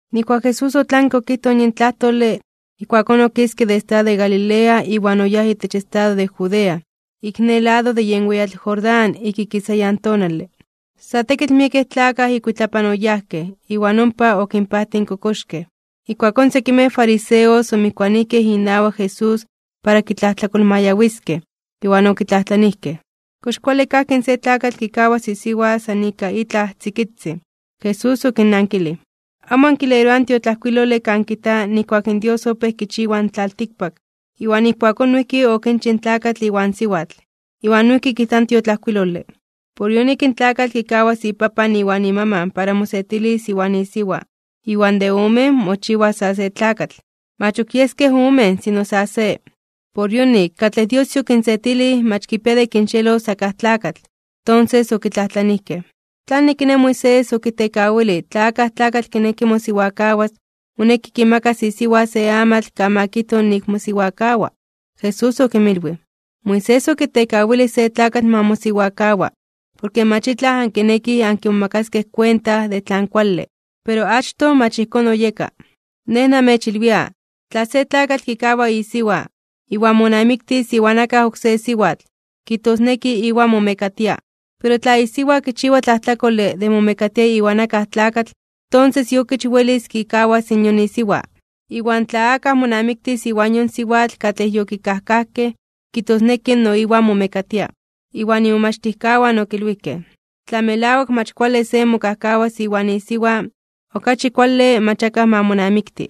Nijkuak Jesús otlanke okijtoj yin tlajtole, ijkuakón okiske de estado de Galilea iwan oyáj itech estado de Judea, ik ne lado de yen weyatl Jordán ik ikisayan tonale. Sa tekitl miekej tlakaj ikuitlapan oyajkej, iwan ompa okinpajtij in kokoxkej. Ijkuakón sekimej fariseos omijkuanijkej inawak Jesús para kitlajtlakolmayawiskej, iwan okitlajtlanijkej: ―¿Kox kuale kajki in se tlakatl kikawas isiwa san ika itlaj tzikitzin? Jesús okinnankilij: ―¿Amo ankileroaj in tiotlajkuilole kan kijta nijkuak in Dios opéj kichiwa in tlaltikpak, iwan ijkuakón noijki okinchij in tlakatl iwan siwatl? Iwan noijki kijta in tiotlajkuilole: “Por yonik in tlakatl kikawas ipapan iwan imaman para mosetilis iwan isiwa, iwan de omen, mochiwas sa se tlakatl.” Mach ok yeskej omen, sino sa se. Por yonik, katlej Dios yokinsetilij mach kipia de kinxeelos akaj tlakatl. Tonses okitlajtlanijkej: ―¿Tlanik kiné, Moisés okitekawilij tla akaj tlakatl kineki mosiwakawas, moneki kimakas isiwa se amatl kan ma kijto nik mosiwakawa? Jesús okinmilwij: ―Moisés okitekawilij se tlakatl ma mosiwakawa, porke mach itlaj ankinekij ankimomakaskej kuenta de tlan kuale. Pero achtoj mach ijkón oyeka. Nej namechilwia, tla se tlakatl kikawa isiwa, iwan monamiktis iwan akaj oksé siwatl, kijtosneki iwan momekatia. Pero tla isiwa kichiwa tlajtlakole de momekatia iwan akaj tlakatl, tonses iokich welis kikawas in yon isiwa. Iwan tla akaj monamiktis iwan yon siwatl katlej yokikajkajkej, kijtosneki no iwan momekatia. Ijkuakón imomachtijkawan okilwijkej: ―Tla melawak mach kuale se mokajkawas iwan isiwa, okachi kuale mach akaj ma monamikti.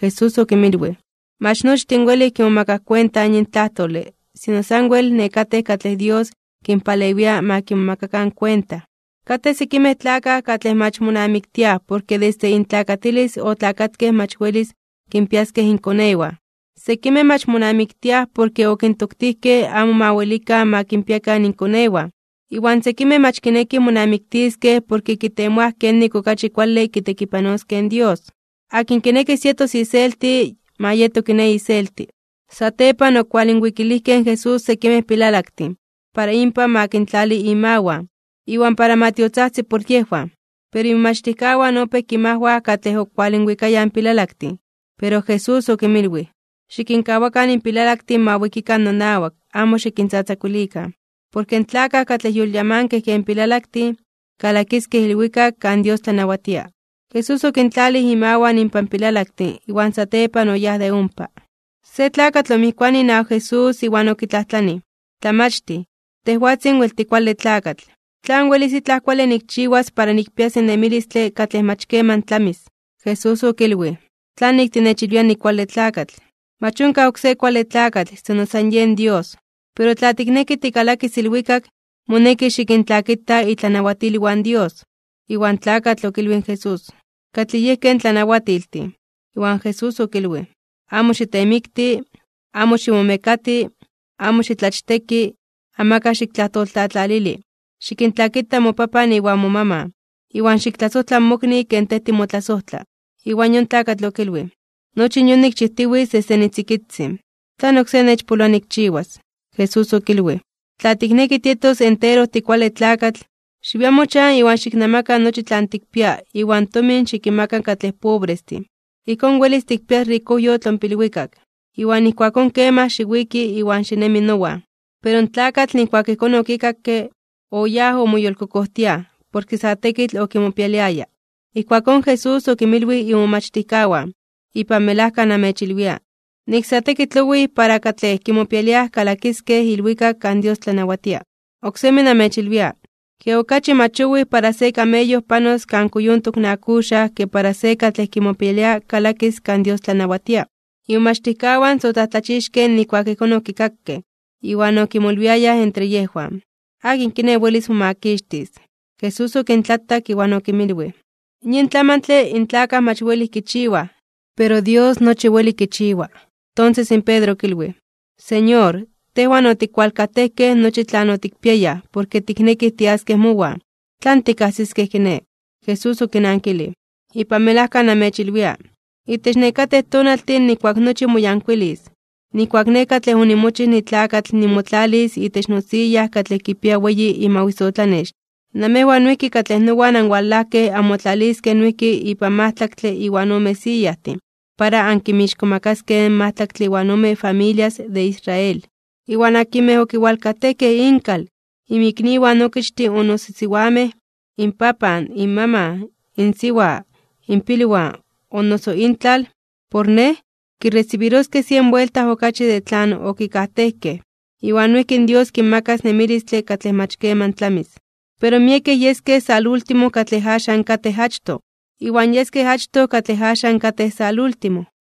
Jesús okinmilwij: ―Mach nochtin welij kimomakaj kuenta yin tlajtole, sino sanwel nekatej katlej Dios kinpalewia ma kimomakakan kuenta. Katej sekimej tlakaj katlej mach monamiktiaj porke desde intlakatilis otlakatkej mach welis kinpiaskej inkonewan. Sekimej mach monamiktiaj porke okintoktijkej amo ma welikan ma kinpiakan inkonewan. Iwan sekimej mach kinekij monamiktiskej porke kitemoaj kenik okachi kuale kitekipanoskej in Dios. Akin kinekis yetos iselti, ma yeto kiné iselti. Satepan okualinwikilijkej in Jesús sekimej pilalaktin, para inpan ma kintlali imawan, iwan para ma tiotzajtzi por yejwan. Pero imomachtijkawan opéj kinmajwaj katlej okualinwikayaj in pilalaktin. Pero Jesús okinmilwij: ―Xikinkawakan in pilalaktin ma wikikan nonawak, amo xikintzatzakuilikan. Porke in tlakaj katlej yolyamankej ken pilalaktin, kalakiskej ilwikak kan Dios tlanawatia. Jesús okintlalij imawan inpan pilalaktin, iwan satepan oyáj de ompa. Se tlakatl omijkuanij inawak Jesús iwan okitlajtlanij: ―Tlamachtij, tejwatzin wel tikuale tlakatl. ¿Tlan welis itlaj kuale nikchiwas para nikpias nemilistle katlej mach keman tlamis? Jesús okilwij: ―¿Tlanik tinechilwia nikuale tlakatl? Mach onkaj oksé kuale tlakatl, sino san yen Dios. Pero tla tikneki tikalakis ilwikak, moneki xikintlakita itlanawatilwan in Dios. Iwan tlakatl okilwij in Jesús: ―¿Katlij yejkej tlanawatiltin? Iwan Jesús okilwij: ―Amo xitemikti, amo ximomekati, amo xitlachteki, amakaj xiktlajtoltlatlalili, xikintlakita mopapan iwan momaman, iwan xiktlasojtla mokni ken tej timotlasojtla. Iwan yon tlakatl okilwij: ―Nochi yon nikchijtiwitz desde nitzikitzin. ¿Tlan oksé nechpoloa nikchiwas? Jesús okilwij: ―Tla tikneki tietos entero tikuale tlakatl, xiwia mochan iwan xiknamaka nochi tlan tikpia iwan tomin xikinmaka katlej pobrestin. Ijkón welis tikpias rikojyotl ompa ilwikak. Iwan ijkuakón kemaj xiwiki iwan xinemi nowan. Pero in tlakatl nijkuak ijkón okikakke, oyáj omoyolkokojtiaj, porke sa tekitl okimopialiaya. Ijkuakón Jesús okinmilwij imomachtijkawan: ―Ipan melajka namechilwia, nik sa tekitl owij para katlej kimopialiaj kalakiskej ilwikak kan Dios tlanawatia. Oksemi namechilwia, ke okachi mach owij para se kameyo panos kan kuyontok in akuxaj ke para se katlej kimopialia kalakis kan Dios tlanawatia. Imomachtijkawan sa otlajtlachixkej (omomajmawtijkej) nijkuak ijkón okikakej, iwan okimolwiayaj entre yejwan: ―¿Akin kiné welis momakixtis? Jesús okintlatak, iwan okinmilwij: ―Yin tlamantle in tlakaj mach welij kichiwaj, pero Dios nochi weli kichiwa. Tonses in Pedro okilwij: ―Señor, tejwan otikwalkajtejkej nochi tlan otikpiayaj porke tiknekij tiaskej mowan. ¿Tlan tikkajsiskej kiné? Jesús okinankilij: ―Ipan melajka namechilwia, itech nekatej tonaltin nijkuak nochi moyankuilis, nijkuak Nej katlej onimochij nitlakatl nimotlalis itech nosiya katlej kipia weyi imawisotlanex, namejwan noijki katlej nowan anwalajkej anmotlaliskej noijki ipan majtlaktle iwan ome siyajtin, para ankinmixkomakaskej in majtlaktle iwan ome familias de Israel. Iwan akinmej okiwalkajtejkej inkal, inmikniwan okichtin o noso siwamej, inpapan, inmaman, insiwa, inpilwan, o noso intlal, por Nej, kiresibiroskej sien buelta okachi de tlan okikajtejkej, iwan noijki Dios kinmakas nemilistle katlej mach keman tlamis. Pero miekej yeskej salúltimo katlej axan katej achtoj, iwan yeskej achtoj katlej axan katej salúltimo.